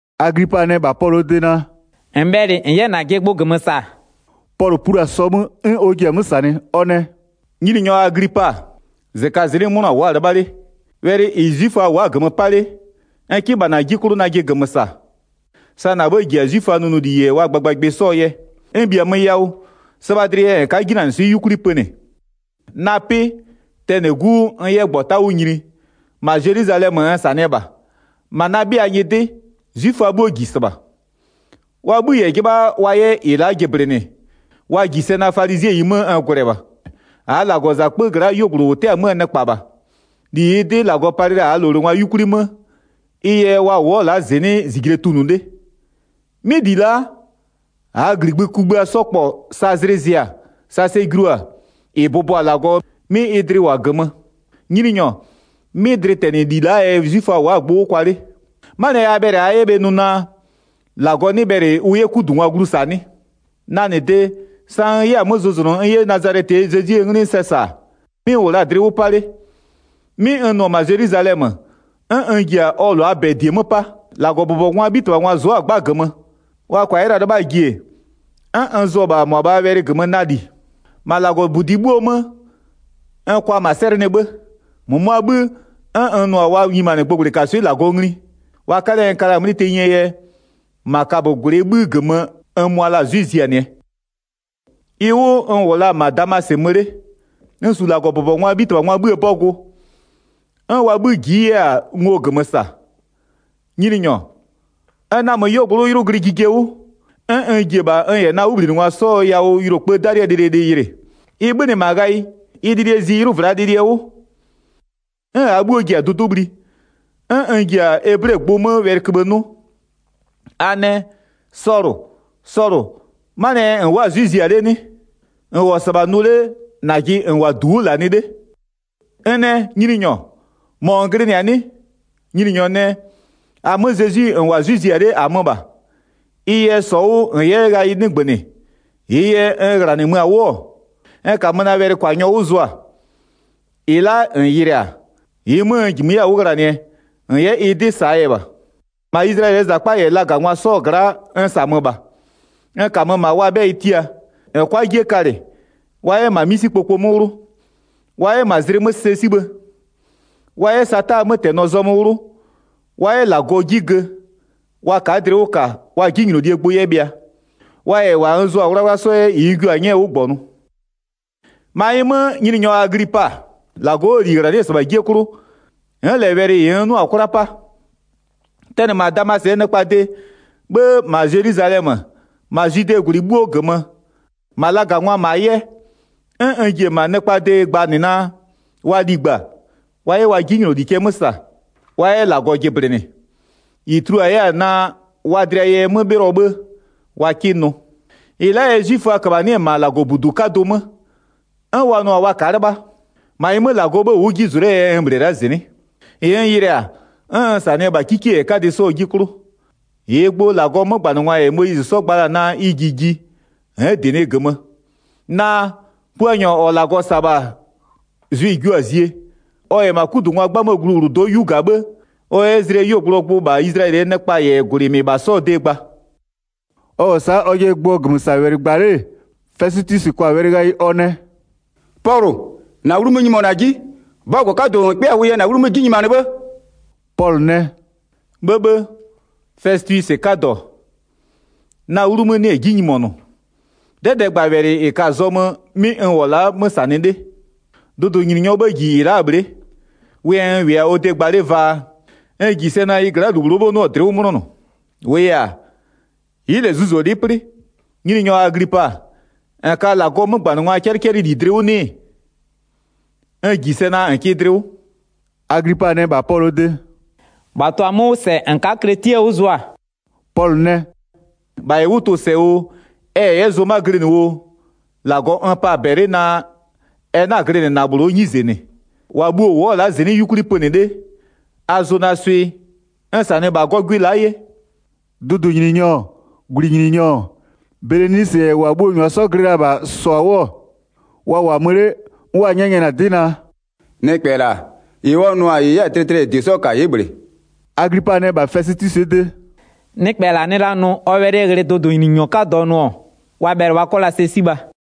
Aglipa nɛ -bha Pɔlʋɔ de naa: “-N bhɛlɩ -n 'yɛ -najɩ gbʋ -gömö -sa.” Pɔlʋ plu-a sɔ 'mö 'n ɔ ji-a 'mö -sanɩ. Ɔ nɛ: “Nyininyɔ Aglipa, -zɩkazɩnɩ'ɩ 'mʋna wʋ'ʋ-a 'lɩbha 'le, wɛlɩ -ɩ 'zwiföa wʋ'ʋ-a -gömö 'pa 'le, n 'kɩ -bha -na 'ji 'klʋ najɩ -gömö -sa. Sa -na 'bhë -ji-a 'zwiföaa nʋnʋli -yɛ wa gbagbagbɩ 'sɔɔ yɛ, n -bhiamö yawʋ sɩbha dlɩ yɛ -n ka'a 'jinanɩswɩ'ɩ 'yukwli pönɩ. Na 'pɩ, tɛnɩ 'gu 'wʋ n 'yɛ -gbɔta 'wʋ nyini, -ma Zelwizalɛmö n -sanɩɛ -bha, -ma na 'bhɩa nyɩdɩ, 'zwiföa 'bhuo -ji -sɩbha. Wa 'bhï -yɛ 'jɩbha wa 'yɛ -ɩ la'a jɩblɩnɩ, wa -ji sɛ naa, falizɩɛyi 'mö n gwlɛ -bha. -Aa -Lagɔzakpö gla'aa 'yuogblʋ -ʋ 'tɛ-a 'möö nɩkpa -bha. 6-Li -ɩɩ 'dɩ -Lagɔ palɩ la-a -aa -lowlengwa 'yukwli 'mö, ɩ yɛ wa wʋ'ʋ-ɔ la'a -zɩnɩ'ɩ -zijle tunʋ 'le. 'Mɩ -li la'a, -aa -gligbï kugbïa 'sɔ -kpɔ sa zlɩ zɩ-a, sa sɛ julu-a -ɩ bʋbɔ-a -Lagɔ, 'mɩ ɩ dlɩ -wʋ-a -gömö. Nyininyɔ, 'mɩ dlɩtɛnɩli la'aa yɛ 'zwiföa wʋ'ʋ-a gbʋ 'wʋ kwa 'le. 'Manɩɛ yɛ a bhɛlɩ-a a 'yɛ bhe nʋ naa, -Lagɔ 'nɩ bhɛlɩ ʋ 'yɛ 'kudungwa glu -sa 'nɩ? Na -nɩ de, sa n 'yɛ-a 'mö zʋzʋnʋ n 'yɛ Nazalɛtɩɛ Zezwie 'nglɩ sɛ -sa, 'mɩ n -wʋ la-a dlɩ 'wʋ 'pa 'le. 'Mɩ n nʋ-ɔ -ma Zelwizalɛmö, 'n n ji-a ɔ -lʋaa -bɛ -die 'mö 'pa, -Lagɔbʋbɔngwaa 'bhitɩbhangwa zʋ'ʋ-a 'gba -gömö, wa -kʋa la 'yɛ 'lɩbhaa ji-e, 'n n zʋ-ɔ -bha -mʋabhaa wɛlɩ -gömö na -li. 11-Ma -Lagɔbudi 'bhuoo 'mö, n kʋa -ma 'sɛlɩnɩ 'bhë, -mʋmʋaa 'bhï, 'n n nʋ-a wa nyimanɩ gbʋgblɩkaswɩ'ɩ -Lagɔ ngli. Wa 'kalɛ n ka la-a 'mlɩ tenyie yɛ -ma kabögwlɩɛ 'bhï -gömö n mʋa la-a 'zwɩ -zianɩɛ. Ɩ 'wʋ n -wʋ la-a -ma Damasɩ mö 'le, n -su -Lagɔbʋbɔngwaa 'bhitɩbhangwaa 'bhïë 'bɔgʋ, 'n wa 'bhï ji'i 'yɛ-a ngo -gömö -sa. Nyininyɔ, n namö 'yuogblʋ'ʋ 'ylʋ glɩ jije 'wʋ, 'n n ji-e -bha n -yɛ na 'wʋbhlinɩngwa 'sɔɔ yawʋ yʋlokpëë 'dalɩɛ lɩlɩlɩ yɩlɩ, ɩ 'bhönɩ -ma ghayɩ, ɩ lɩlɩɛ zi 'ylʋvlaa lɩlɩɛ 'wʋ. 'N -aa 'bhuo ji-a dʋdʋ'ʋ bhli. 'N n ji-a eblegbʋ 'mö wɛlɩköbhë 'nʋ: A nɛ: Sɔlʋ, Sɔlʋ, 'manɩɛ yɛ -n wʋ'ʋ-a 'zwɩ -zia 'le 'nɩ? -N -wʋ-ɔ -sɩbha nʋ 'le -najɩ -n -wʋ-a -du 'wʋ -lanɩ 'le. N nɛ: Nyininyɔ, -mɔ -n glɩnɩ-a 'nɩ? Nyininyɔ nɛ: -Amö Zezwi -n -wʋ-a 'zwɩ -zia 'le, -amö -bha. Ɩ yɛ, -sɔ 'wʋ -n 'yɛ ghayɩ 'nɩgbönɩ -ɩɩ yɛ n -ghlanɩmö-a 'wʋ-ɔ, n -kamö na wɛlɩkwanyɔ 'wʋ zʋa, -ɩ la'a -n yɩlɩ-a, -ɩɩ 'mö n -jimö 'yɛ-a 'wʋ ghlanɩɛ, -n 'yɛ ɩ 'dɩ -saa yɛ -bha. 17-Ma Izlayɛlɩɛ -zakpa -yɛ lagangwa 'sɔɔ gla'a n -samö -bha, n -kamö -ma wa 'bhɛyɩ tia, 18-n 'kʋa 'jie kalɩ, wa 'yɛ -ma 'misikpoko 'mö 'wlʋ, wa 'yɛ -ma zlɩ 'mö sɛ 'sibhë. Wa 'yɛ Sataa 'mötɛnɔ zɔmö 'wlʋ, wa 'yɛ -Lagɔ 'ji gö, wa ka'a dlɩ 'wʋ -ka wa 'jinylolie gbʋ 'yɛ bhɩa, wa -yɛ -wa n zʋa-a 'wlawla 'sɔ 'yɛ -ɩ n jua-a 'nyɛɛ 'wʋ -gbɔnʋ. Pɔlʋ yɛ ɔ nʋnʋlie 'dɩ -sa 19-Ma ɩ 'mö, Nyininyɔ Aglipa, -Lagɔ 'wʋɔ -li -ghlanɩ'ɩ-ɛ -sɩbha 'jie 'klʋ, n'n -lɛ wɛlɩ -ɩ n 'nʋ-a 'kwla 'pa. Tɛnɩ -ma Damasɩɛ nɩkpaa de, 'bhë -ma Zelwizalɛmö, -ma Zwidee -gwlɩ 'bhuo -gömö, -ma lagangwaa -ma 'yɛ, 'n n ji-e -ma nɩkpaa de gbanɩ naa: wa ligba, wa 'yɛ wa 'jinyloli cɛ 'mö -sa, wa 'yɛ -Lagɔ jɩblɩnɩ. -Ɩ tulua 'yɛ-a naa wa dlɩa yɛ 'mö 'bhɩlɔ 'bhë wa 'kɩ nʋ. 21-Ɩ la'aa yɛ 'zwiföa -köbhanɩ'ɩ-ɛ -ma -Lagɔbudu 'kadʋ 'mö, 'n wa nʋ-a wa ka'a 'lɩbha. 22-Ma ɩ 'mö -Lagɔɔ 'bhë wʋ'ʋ 'ji zʋ 'lee yɛ n -bhlɩɛ la'a -zɩnɩ'ɩ. -Ɩ n yɩlɩ-a, 'n n -sanɩɩ-ɛ -bha 'kikie -yɛ 'kadɩ 'sɔɔ 'ji 'klʋ. -Ɩɩ gbʋ -Lagɔɔ 'mögbanɩngwa -yɛ Moyizɩ 'sɔ gba la-a naa ɩ ji ji n'n -dɩnɩɩ -gömö. Naa, Puanyɔ -ɔ -Lagɔ -sa-a -bha zwɩ-ɩ jio-a zie, ɔ -yɛ -ma 'kudungwaa 'gbamöwlʋdo'o 'yu -ga 'bhë, ɔ 'yɛ zlɩɛ 'yuogblʋɔ gbʋ -bha Izlayɛlɩɛ nɩkpa -yɛ -gwlɩ -mɩbha 'sɔɔ de gba.” Ɔ -wʋ-ɔ sa'a ɔjɩɛ gbʋɔ -gömösawɛlɩ gba 'le-e, Fɛsɩtwisɩ kwa-a wɛlɩ ghayɩ ɔ nɛ: “Pɔlʋ, -na wlu mö-ö nyimonʋ-a 'ji! 'Bɔgʋ 'kadʋ -n 'kpɩa-a yɛ -na 'wlu 'mö 'ji nyimanɩ 'bhë!” Pɔlʋ nɛ: “'Bhëbhë, Fɛsɩtwisɩ 'kadɔ, na 'wlu 'mö 'nɩ-ɛ 'ji nyimonʋ, 'dɛdɛɛgbawɛlɩ -ɩ ka-a zɔmö 'mɩ n -wʋ-ɔ la'a 'mö -sanɩ 'le. Dʋdʋnyininyɔɔ 'bhë -ji -ɩ la'aa bhle'e, wʋ yɛ n -wʋɩ-a ɔ de gba 'le vaa, n -ji sɛ naa ɩ gla'aa -lu -bhlʋɔ 'bhë 'nɩɔ-ɔ dlɩ'ɩ 'mʋnɔnʋ, -wʋʋ yɛ-a, ɩ'ɩ -lɛ zuzolɩ'ɩ 'plɩ. Nyininyɔ Aglipa, -n ka -Lagɔɔ 'mögbanɩngwaa 'cɛlɩcɛlɩwɛlɩ dlɩ 'wʋ 'nɩ-ɩ? N -ji sɛ naa -n kɩ dlɩ 'wʋ.” Aglipa nɛ -bha Pɔlʋɔ de: “-Bha tʋ-a 'mö 'wʋ -sɛ -n ka'a kletiɛ 'wʋ zʋa.” Pɔlʋ nɛ: “-Bha -yɛ 'wʋ tʋ-ʋ -sɛ oo ɛ -yɛ 'yɛ zʋma glɩnɩ oo, -Lagɔ n pa-a -bɛlɩ naa ɛ 'na-a glɩnɩ -na -bhlʋɔ 'nyize -nɩ, -wa bhuo-o wʋ'ʋ-ɔ la'a -zɩnɩ'ɩ 'yukwli pönɩ 'le, a zʋ na swɩ n -sanɩ -bha gɔgwɩ la'a 'ye.” Dʋdʋnyininyɔ-ɔ, -gwlɩnyininyɔ-ɔ, Belenisɩ -yɛ -wa bhuo-o -nyʋa 'sɔ glɩ la-a -bha -sɔ-a 'wʋ, wa -wʋ-a mö 'le, 'n wa 'nyɛnyɛnɩ-a 'dɩ naa: “Nɩkpɛ -la, -ɩ ɔ nʋ-a -ɩ 'yɛ-a tlɩtlɩɛ -yɛ -die 'sɔ -ka ɩ'ɩ -bhlɩ.” Aglipa nɛ -bha Fɛsɩtwisɩɛ de: “Nɩkpɛ -la nɩ la nʋ ɔ wɛlɩ ghlɩ dʋdʋnyininyɔ 'kadɔ nʋ-ɔ, wa bhɛlɩ wa 'kɔ la sɛ 'sibha.”